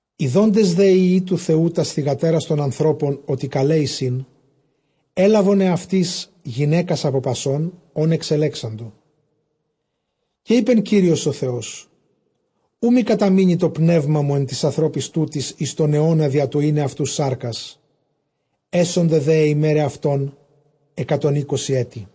Ἰδόντες δὲ υἱοὶ τοῦ Θεοῦ τὰς θυγατέρας τῶν ἀνθρώπων, ὅτι καλαί εἰσιν, ἔλαβον ἑαυτοῖς γυναῖκας ἀπὸ πασῶν, ὧν ἐξελέξαντο. Καὶ εἶπε Κύριος ὁ Θεὸς, οὐ μὴ καταμείνῃ τὸ πνεῦμά μου ἐν τοῖς ἀνθρώποις τούτοις εἰς τὸν αἰῶνα, διὰ τὸ εἶναι αὐτοὺς σάρκας· ἔσονται δὲ αἱ ἡμέραι αὐτῶν, ἑκατὸν εἴκοσιν ἔτη.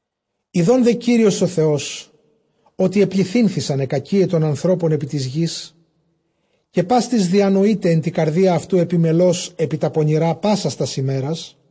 Ἰδὼν δὲ Κύριος ὁ Θεὸς, ὅτι ἐπληθύνθησαν αἱ κακίαι τῶν ἀνθρώπων ἐπὶ τῆς γῆς, καὶ πᾶς τις διανοεῖται ἐν τῇ καρδίᾳ αὐτοῦ ἐπιμελῶς ἐπὶ τὰ πονηρὰ πάσας τὰς ἡμέρας·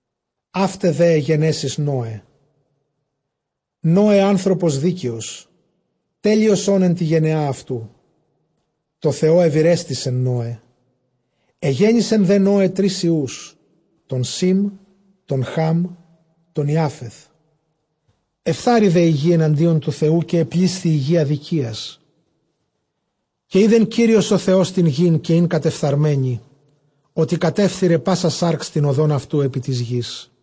Αὗται δὲ αἱ γενέσεις Νῶε. Νῶε ἄνθρωπος δίκαιος, τέλειος ὢν ἐν τῇ γενεᾷ αὐτοῦ, τῷ Θεῷ εὐηρέστησε Νῶε. Ἐγέννησε δὲ Νῶε τρεῖς υἱοὺς, τὸν Σὴμ, τὸν Χὰμ, τὸν Ἰάφεθ. Ἐφθάρη δὲ ἡ γῆ ἐναντίον τοῦ Θεοῦ, καὶ ἐπλήσθη ἡ γῆ ἀδικίας. Καὶ εἶδε Κύριος ὁ Θεὸς τὴν γῆν, καὶ ἦν κατεφθαρμένη· ὅτι κατέφθειρε πᾶσα σὰρξ τὴν ὁδὸν αὐτοῦ ἐπὶ τῆς γῆς.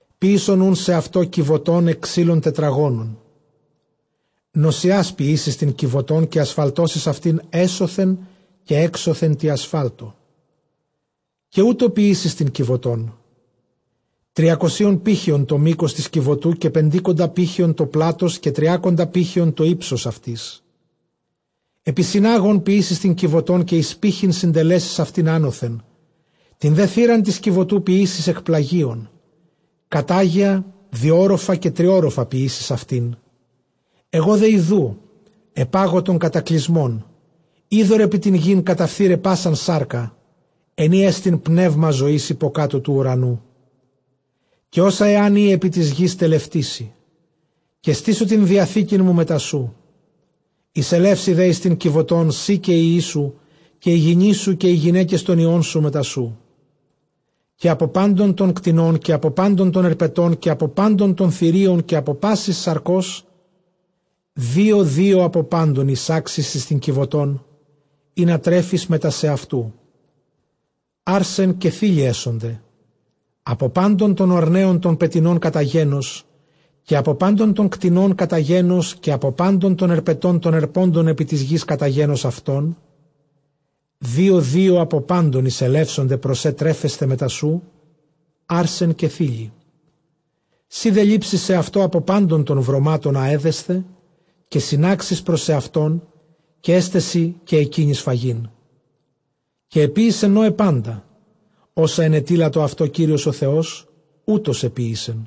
Ποίησον οὖν σεαυτῷ κιβωτὸν ἐκ ξύλων τετραγώνων· νοσσιὰς ποιήσεις τὴν κιβωτόν· καὶ ἀσφαλτώσεις αὐτὴν ἔσωθεν καὶ ἔξωθεν τῇ ἀσφάλτῳ. Καὶ οὕτω ποιήσεις τὴν κιβωτόν· τριακοσίων πήχεων τὸ μῆκος τῆς κιβωτοῦ, καὶ πεντήκοντα πήχεων τὸ πλάτος, καὶ τριάκοντα πήχεων τὸ ὕψος αὐτῆς. Ἐπισυνάγων ποιήσεις τὴν κιβωτὸν, καὶ εἰς πῆχυν συντελέσεις αὐτὴν ἄνωθεν· τὴν δὲ θύραν τῆς κιβωτοῦ ποιήσεις ἐκ πλαγίων· κατάγαια διώροφα καὶ τριώροφα ποιήσεις αὐτήν. Ἐγὼ δὲ ἰδοὺ ἐπάγω τὸν κατακλυσμὸν, ὕδωρ ἐπὶ τὴν γῆν, καταφθεῖραι πᾶσαν σάρκα, ἐν ᾗ ἐστι πνεῦμα ζωῆς ὑποκάτω τοῦ οὐρανοῦ· καὶ ὅσα ἂν ᾖ ἐπὶ τῆς γῆς, τελευτήσει. Καὶ στήσω τὴν διαθήκην μου μετά σου· εἰσελεύσῃ δὲ εἰς τὴν κιβωτὸν σὺ, καὶ οἱ υἱοί σου, καὶ ἡ γυνή σου, καὶ αἱ γυναῖκες τῶν υἱῶν σου μετά σου. Καὶ ἀπὸ πάντων τῶν κτηνῶν, καὶ ἀπὸ πάντων τῶν ἑρπετῶν, καὶ ἀπὸ πάντων τῶν θηρίων, καὶ ἀπὸ πάσης σαρκὸς δύο δύο ἀπὸ πάντων εἰσάξεις εἰς τὴν κιβωτὸν, ἵνα τρέφῃς μετὰ σεαυτοῦ· ἄρσεν καὶ θῆλυ ἔσονται. Ἀπὸ πάντων τῶν ὀρνέων τῶν πετεινῶν κατὰ γένος, καὶ ἀπὸ πάντων τῶν κτηνῶν κατὰ γένος, καὶ ἀπὸ πάντων τῶν ἑρπετῶν τῶν ἑρπόντων ἐπὶ τῆς γῆς κατὰ γένος αὐτῶν, δύο δύο ἀπὸ πάντων εἰσελεύσονται πρὸς σὲ τρέφεσθαι μετά σου, ἄρσεν καὶ θῆλυ. Σὺ δὲ λήψῃ σεαυτῷ ἀπὸ πάντων τῶν βρωμάτων ἃ ἔδεσθε, καὶ συνάξεις πρὸς σεαυτὸν, καὶ ἔσται σοι καὶ ἐκείνοις φαγεῖν. Καὶ ἐποίησε Νῶε πάντα ὅσα ἐνετείλατο αὐτῷ Κύριος ὁ Θεὸς, οὕτως ἐποίησε.